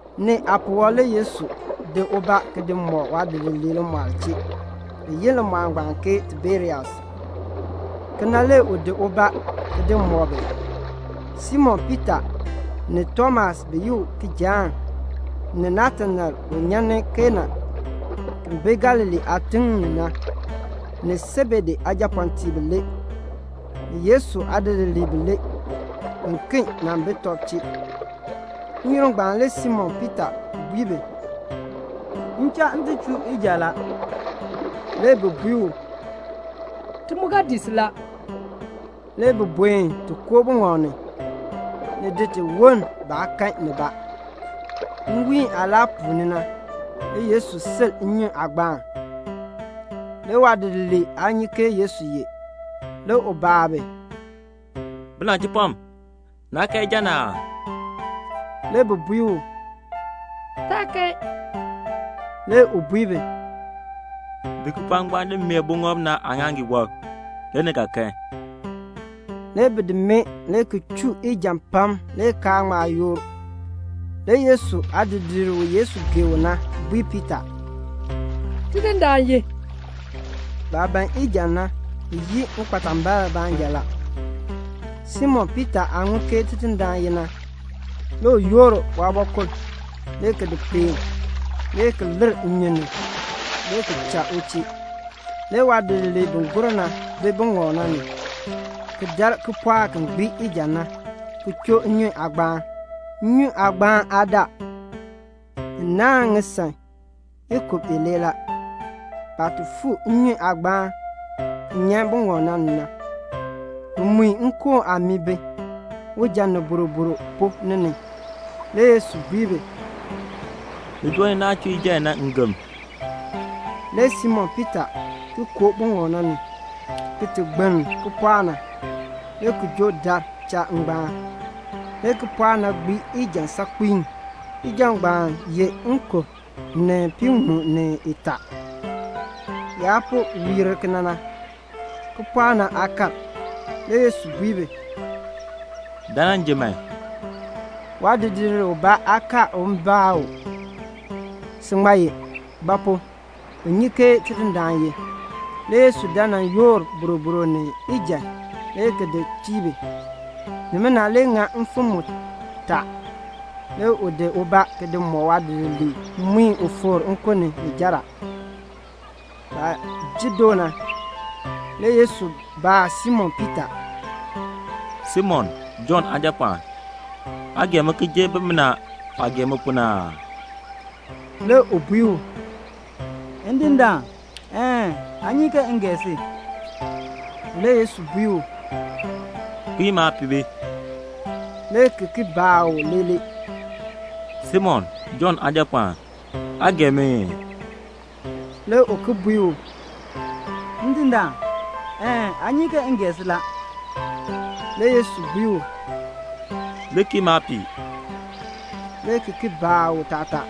Nee aapuwɔb le Yesu di ubaa ki di mɔk waadidiliib limɔɔl chee, bi yi limɔɔl ngbaan ke Tiberias. Kena le u di ubaa ki di mɔk bi. Simon Piita ni Tomas bi yi u Kijaan, ni Natanael u nyan ni Kana ki bi Galilee aatiŋ ni na, ni Sebedee aajapɔɔtiib bilee, ni Yesu aadidiliib bilee biken nan bi tɔb chee. N-yoonn ngbaan le Simon Piita bui bi, "M cha m ti chur ijan la." Le bi bui u, "Ti mu ga dii si la." Le bi buen ti koo buŋɔb ni, ni di ti woln baa kan nibaa. Nwiin aah laa puuni na, le Yesu sil nnyun aagbaan. Le waadidiliib aa nyi ke Yesu ye. Le u baa bi, "Binachipɔm, naa kan ijan aa?" Le bi bui u, "Taa kan." Le u bui bi, "Di kipɔɔk ngbaan di mee buŋɔb na aaŋaaŋgii wɔb, le ni ga kan." Le bi di mee le ki chuu ijan pam le kaa ŋma yoor. Le Yesu aadidiir u Yesu gee u na bui Piita, "Tidindaan ye." Baah ban ijan na bi yii ŋikpatambiln baanja la. Simon Piita aah ŋun ke Tidindaan ye na, le u yoor waabɔkul le ki di peen, le ki lir nnyun ni le ki cha u chee. Le waadidiliib bi gur na bi buŋɔb na ni ki dar kipɔɔk ki gbii ijan na, ki choo nnyun aagbaan. Nnyun aagbaan aa daa. Ni naahn ŋisaŋ ikub ilee la. Baah ti fuu nnyun aagbaan ki nyan buŋɔb ni na, bi mui nkoon aamii bi, ujan ni boroboro pu ni ni. Le Yesu bui bi, "Li joo ni naah chuu ijan i na ngem." Le Simon Piita ki koo buŋɔb na ni ki ti gbiln kipɔɔk na, le ki joo dar cha ngbaan. Le kipɔɔk na gbii ijan saakpiin. Ijan ngbaan ye nkub ni piiŋmu ni itaa. Yaah po wiir kena na, kipɔɔk na aa kar. Le Yesu bui bi, "Dan nan ji man." Waadidiir ubaa aa kaar un baa u, "Si ŋmaa ye?" ba pu? bi nyi ke Tidindaan ye. Le Yesu dan nan yoor boroboro ni ijan le ki di tii bi. Nimina le ŋa mfim mutaa le u di ubaa di mɔk waadidiliib mui u fikr nkun ni ni jer a. Baah ji doo na, le Yesu baa Simon Piita, "Simon, Jɔnn aajapɔɔn, aa gee mi ki jer bimina aah gee mi pu na aa?" Le u bui u, "Ndindaan, een, aa nyi ke m gee si." Le Yesu bui u, "Kpiin maapihbi," le ki ki baa u leeler, "Simon, Jɔnn aajapɔɔn, aa gee mi ii?" Le u ki bui u, "Ndindaan, een, aa nyi ke m gee si la." Le Yesu bui u, "Li kii maapiih," le ki ki baa u taatar,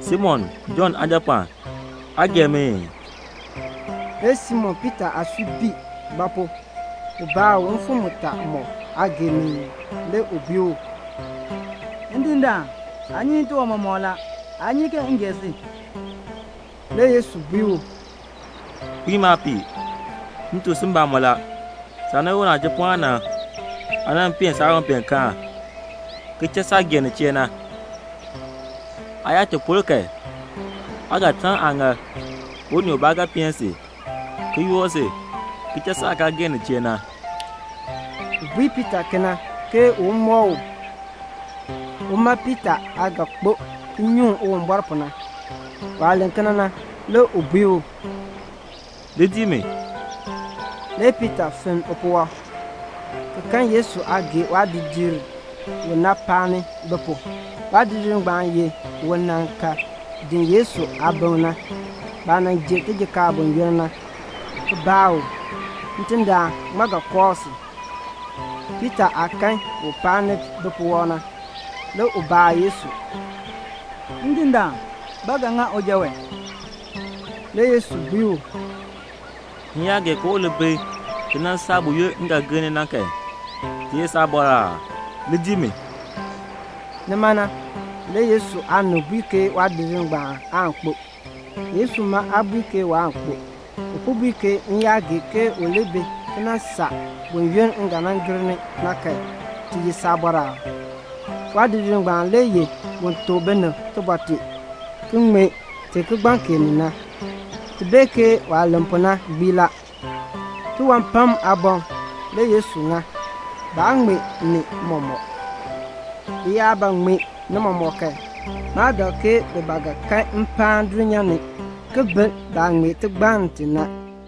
"Simon, Jɔnn aajapɔɔn, aa gee mi ii?" Le Simon Piita aasui bii; ba pu? u baa u mfim mutaa mɔk, "Aa gee mi ii?" Le u bui u, "Ndindaan, aa nyi tiwan mɔmɔk la. Aa nyi ke m gee si." Le Yesu bui u, "Kpiin maapiih. M tuk si mbamɔn la, saah nan ye unachipɔɔn na, aa nan peen saawanpeenkaan, ki cha saah gee nin chee na. Aa yaa ti por kan, aa ga taln aaŋaal, unii ubaa ga peen si, ki yoor si ki cha saah kaa gee nin chee na." U bui Piita kena ke un mɔk u, uma Piita aah ga kpo ki nyuŋ Uwumbɔr pu na. Waah len kena na, le u bui u, "Li dii mi." Le Piita fenn upuwɔb, ki kan Yesu aah gee waadidiir u na paani bi pu. Waadidiir ngbaan ye un nan ka den Yesu aabiŋ na, baah nan ji tijiir buyoonn na, ki baa u, "Ndindaan, ŋmaa ga kooh si?" Piita aah kan u paani bipuwɔb na, le u baa Yesu, "Ndindaan, ba ga ŋa uja wee?" Le Yesu bui u, "M yaa gee ke u li bi ki nan saa buyoonn m ga nan gir ni na kan, ti ye saabɔr aa? Li dii mi." Nima na le Yesu aanib bui ke waadidiir ngbaan aan kpo. Yesu ma aa bui ke waan kpo, u po bui ke "M yaa gee ke u li bi ki nan saa buyoonn m ga nan gir ni na kan, ti ye saabɔr aa?" Waadidiir ngbaan le ye un tuk binib tibɔr tee, ki ŋmee ti kigbaŋ kee ni na. Ti bee ke waah len pu na gbii la. Tiwan pam aaboŋ le Yesu ŋa, baa ŋmee ni mɔmɔk. Bi yaa ba ŋmee ni mɔmɔk kan, maa dak ke bi ba ga kan mpaan dulnyaa ni ki bil baah ŋmee tigbann ti na.